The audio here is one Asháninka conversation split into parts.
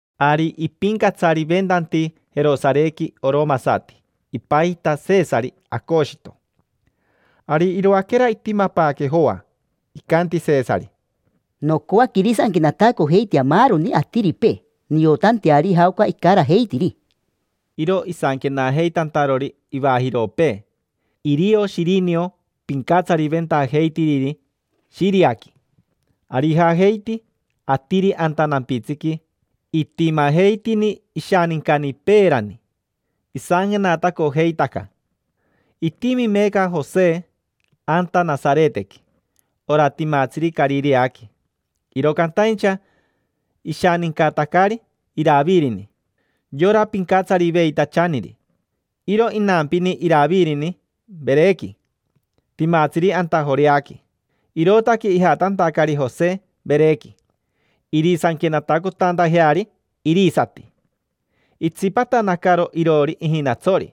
Ari ipincatsariventanti Jerosarequi oromasati, ipajita Shisari Acoshito. Ari iroaquera itimapaaque Joa, icanti Shisari: —Nocoaque irisanquenatacojeitea maaroni atiripee, niotanteari jaoca icarajeitiri. Iro isanquenajeitantarori ivajiropee, irio Shirino pincatsariventajeitiriri shiriasati. Ari ijajeiti atiri anta nampitsiqui itimajeitini ishanincani peerani, isanquenatacojeitaca. Itimi meeca Jose anta Nasaretequi, ora timatsiri Carireaqui. Iro cantaincha ishanincatacari Iravirini: yora pincatsariveitachaniri. Iro inampini Iravirini Verequi, timatsiri anta Joreaqui. Irootaque ijatantacari Jose Verequi, irisanquenatacotantajeari irisati. Itsipatanacaro iroori ijinatsori,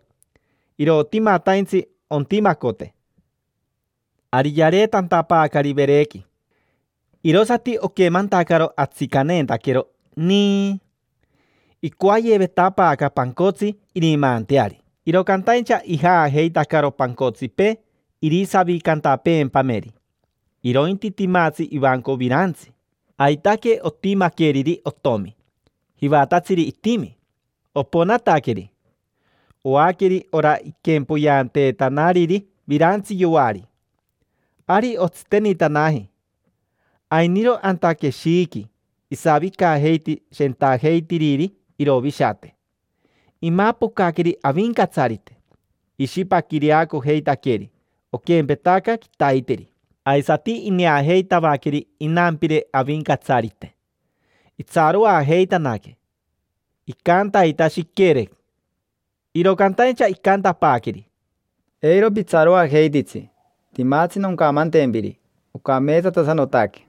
irotimataintsi ontimacote. Ari yareetantapaacari Verequi, irosati oquemantacaro atsicaneentaquero, niii. Icoayevetapaaca pancotsi irimaanteari, iro cantaincha ijaajeitacaro pancotsipee irisavicantapeempameri: irointi timatsi ivanco virantsi. Aitaque otimaqueriri otomi, jivatatsiri itimi. Oponataqueri, oaqueri ora iquempoyeanteetanariri virantsi yoari. Ari otsitenitanaji, ainiro anta queshiiqui isavicajeiti shentajeitiriri irovishate. Imapocaqueri Avincatsarite, ishipaquireacojeitaqueri, oquempetaca quitaiteri, aisati ineajeitavaqueri inampire Avincatsarite. Itsaroajeitanaque; icantaita, shiquere. Iro cantaincha icantapaaqueri: —Eiro pitsaroajeititsi, timatsi noncamantempiri: ocameetsatasanotaque.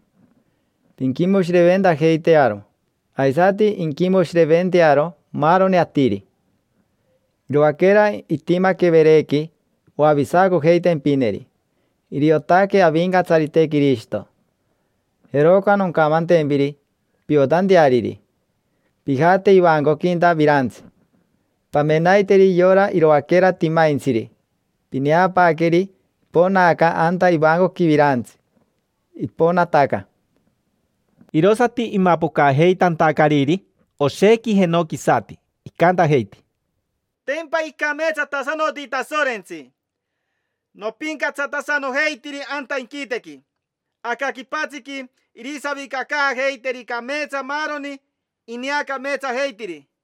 Pinquimoshireventajeitearo, aisati inquimoshireventearo maaroni atiri. Iroaquera itimaque Verequi oavisacojeitempineri: iriotaque Avincatsarite Quirishito. Jeroca noncamantempiri piotanteariri. Pijate ivancoquinta virantsi, pamenaiteri yora iroaquera timaintsiri; pineapaaqueri iponaaca anta ivancoqui virantsi, iponataca. Irosati imapocajeitantacariri oshequi jenoquisati, icantajeiti: —Tempa icameetsatasanoti Tasorentsi, nopincatsatasanojeitiri anta inquitequi. Aca quipatsiqui irisavicacaajeiteri cameetsa maaroni ineacameetsajeitiri.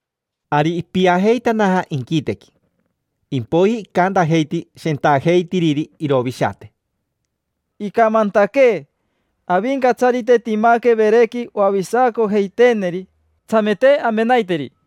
Ari ipiajeitanaja inquitequi, impoiji icantajeiti shentajeitiriri irovishate: —Icamantaquee Avincatsarite timaque Verequi oavisacojeiteeneri. Tsamete amenaiteri.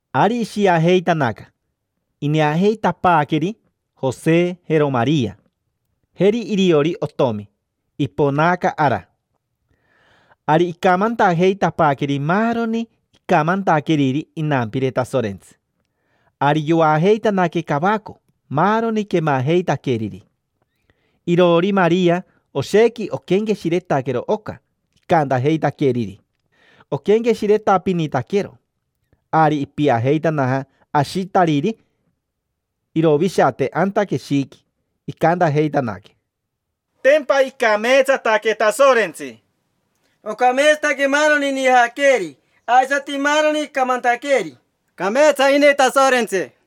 Ari ishiajeitanaca, ineajeitapaaqueri Jose, jero Maria, jeri iriori otomi, iponaaca ara. Ari icamantajeitapaaqueri maaroni icamantaqueriri inampire Tasorentsi. Ari yoajeitanaque cavaco maaroni quemajeitaqueriri. Iroori Maria oshequi oquenqueshiretaquero oca icantajeitaqueriri, oquenqueshiretapinitaquero. Ari ipiajeitanaja ashitariri irovishate anta queshiiqui. Icantajeitanaque: —Tempa icameetsataque Tasorentsi. Ocameetsataque maaroni inijaaqueeri aisati maaroni icamantaqueeri. Cameetsa ini Tasorentsi.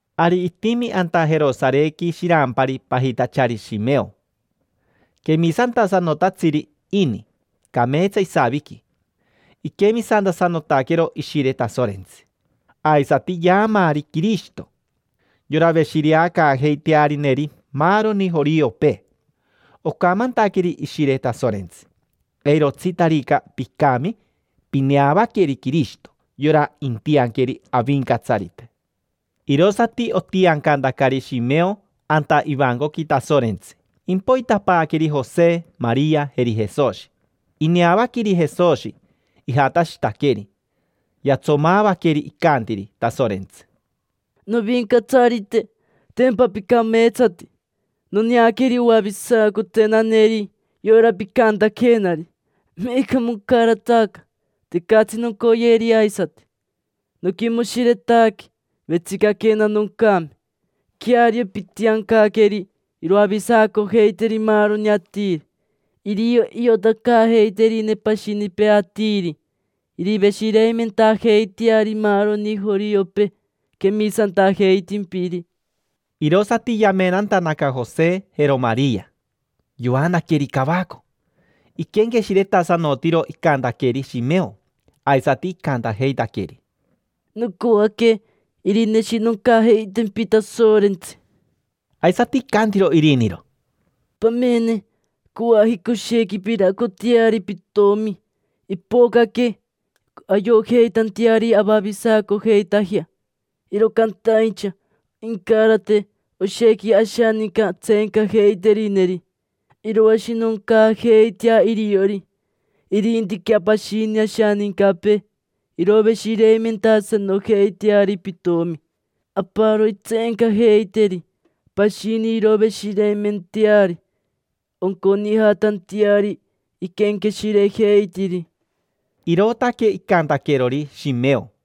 Ari itimi anta Jerosarequi shirampari pajitachari Shimeo. Quemisantasanotatsiri ini, cameetsa isaviqui, iquemisantasanotaquero Ishire Tasorentsi. Aisati yaamaari Quirishito: yora veshireacaajeitearineri maaroni joriopee. Ocamantaqueri Ishire Tasorentsi: “Eirotsitarica picami, pineavaqueri Quirishito: yora intianqueri Avincatsarite”. Irosati otiancantacari Shimeo anta ivancoqui Tasorentsi; impoitapaaqueri Jose, Maria, jeri Jesoshi. Ineavaqueri Jesoshi, ijatashitaqueri, yatsomaavaqueri; icantiri Tasorentsi: —Novincatsarite, tempa picameetsati, noneaqueri oavisacotenaneri, yora picantaquenari. Meeca moncarataca, tecatsi noncoyeri aisati. Noquimoshiretaque, vetsicaquena noncame. Queario, pitiancaqueri iroavisacojeiteri maaroni atiri: irio iotacaajeiterine pashinipee atiri, iriveshireimentajeiteari maaroni joriopee quemisantajeitimpiri. Irosati yamenantanaca Jose, jero Maria, yoanaqueri cavaco; iquenqueshiretasanotiro icantaqueri Shimeo. Aisati icantajeitaqueri: —Nocoaque irineshinoncajeitempi Tasorentsi. Aisati icantiro iriniro: —Pamene, coajica oshequi piraacoteari pitomi: ipocaque ayojeitanteari avavisacojeitajea, iro cantaincha incarate oshequi ashaninca tseencajeiterineri: iroashinoncaajeitea iriori. Irintiquea pashini ashanincapee, iroveshireimentasanojeiteari pitomi. Aparo intseencajeiteri, pashini iroveshireimenteari, onconijatanteari iquenqueshirejeitiri. Irootaque icantaquerori Shimeo.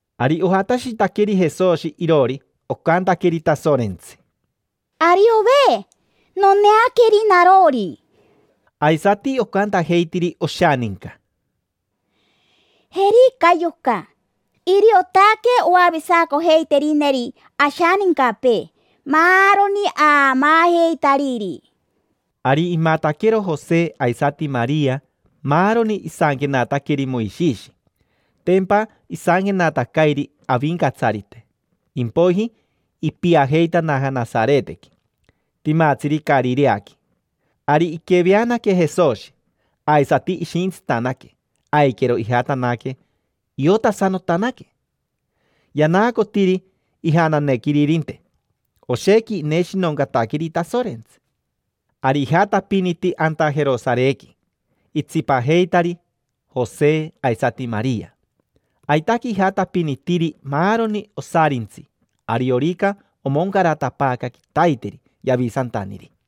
Ari ojatashitaqueri Jesoshi iroori. Ocantaqueri Tasorentsi: —Ariove, noneaqueri narori. Aisati ocantajeitiri oshaninca: —Jerica yoca, iriotaque oavisacojeiterineri ashanincapee: maaroni aamaajeitariri. Ari imataquero Jose aisati Maria maaroni isanquenataqueri Moishishi: tempa isanquenatacairi Avincatsarite. Impoiji ipiajeitanaja Nasaretequi: timatsiri Carireaqui. Ari iqueveanaque Jesoshi, aisati ishintsitanaque, aiquero ijatanaque iotasanotanaque, yanaacotiri ijananequiririnte. Oshequi ineshinoncataqueri Tasorentsi. Ari ijatapiniti anta Jerosarequi, itsipajeitari Jose aisati Maria. Aitaque ijatapinitiri maaroni osarintsi ariorica omoncaratapaaca quitaiteri Yavisantaniri.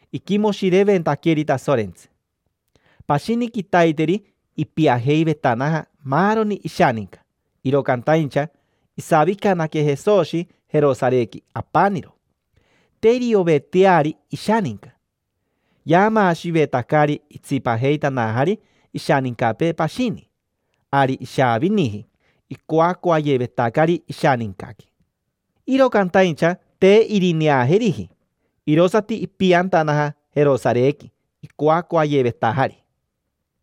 iquimoshireventaqueri Tasorentsi. Pashini quitaiteri ipiajeivetanaja maaroni ishaninca, iro cantaincha isavicanaque Jesoshi Jerosarequi apaniro. Te irioveteari ishaninca, yaamaashivetacari itsipajeitanajari ishanincapee pashini. Ari ishaaviniji icoacoayevetacari ishanincaqui, iro cantaincha te irineajeriji. Irosati ipiantanaja Jerosarequi, icoacoayevetajari,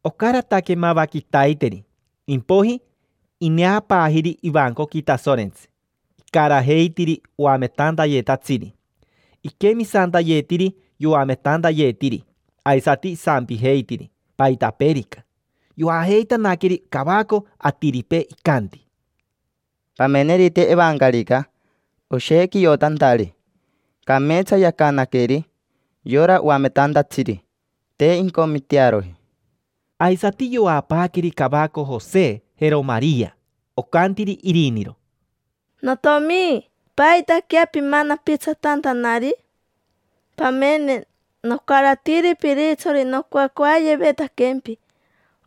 ocarataque mava quitaiteri. Impoiji ineapaajiri ivancoqui Tasorentsi: icarajeitiri oametantayetatsiri. Iquemisantayetiri yoametantayetiri, aisati isampijeitiri paitapeerica. Yoajeitanaqueri cavaco atiripee, icanti: —Pamenerite evancarica: oshequi iotantari, cameetsa yacanaqueri yora oametantatsiri, te incomitearoji. Aisati yoapaaqueri cavaco Jose, jero Maria. Ocantiri iriniro: —Notiomi, ¿paitaquea pimanapitsatantanari? Pamene, nocaratiri piritsori nocoacoayevetaquempi.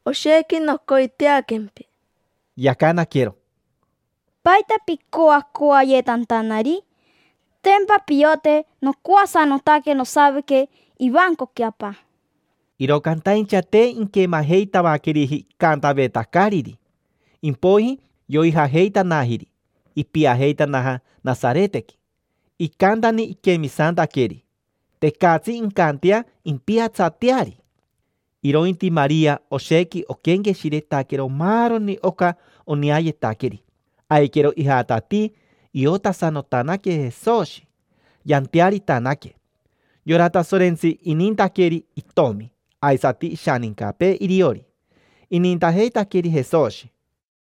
Oshequi nocoiteaquempi. Yacanaquero: —¿Paita picoacoayetantanari? Tempa piote nocoasanotaque nosavique ivancoqui Apa. Iro cantaincha te inquemajeitavaqueriji icantavetacariri. Impoiji yoijajeitanajiri, ipiajeitanaja Nasaretequi. Icantani iquemisantaqueri, tecatsi incantea impiatsateari. Irointi Maria oshequi oquenqueshiretaquero maaroni oca oneayetaqueri. Aiquero ijatatii iotasanotanaque Jesoshi, yantearitanaque. Yora Tasorentsi inintaqueri itomi; aisati ishanincapee iriori, inintajeitaqueri Jesoshi.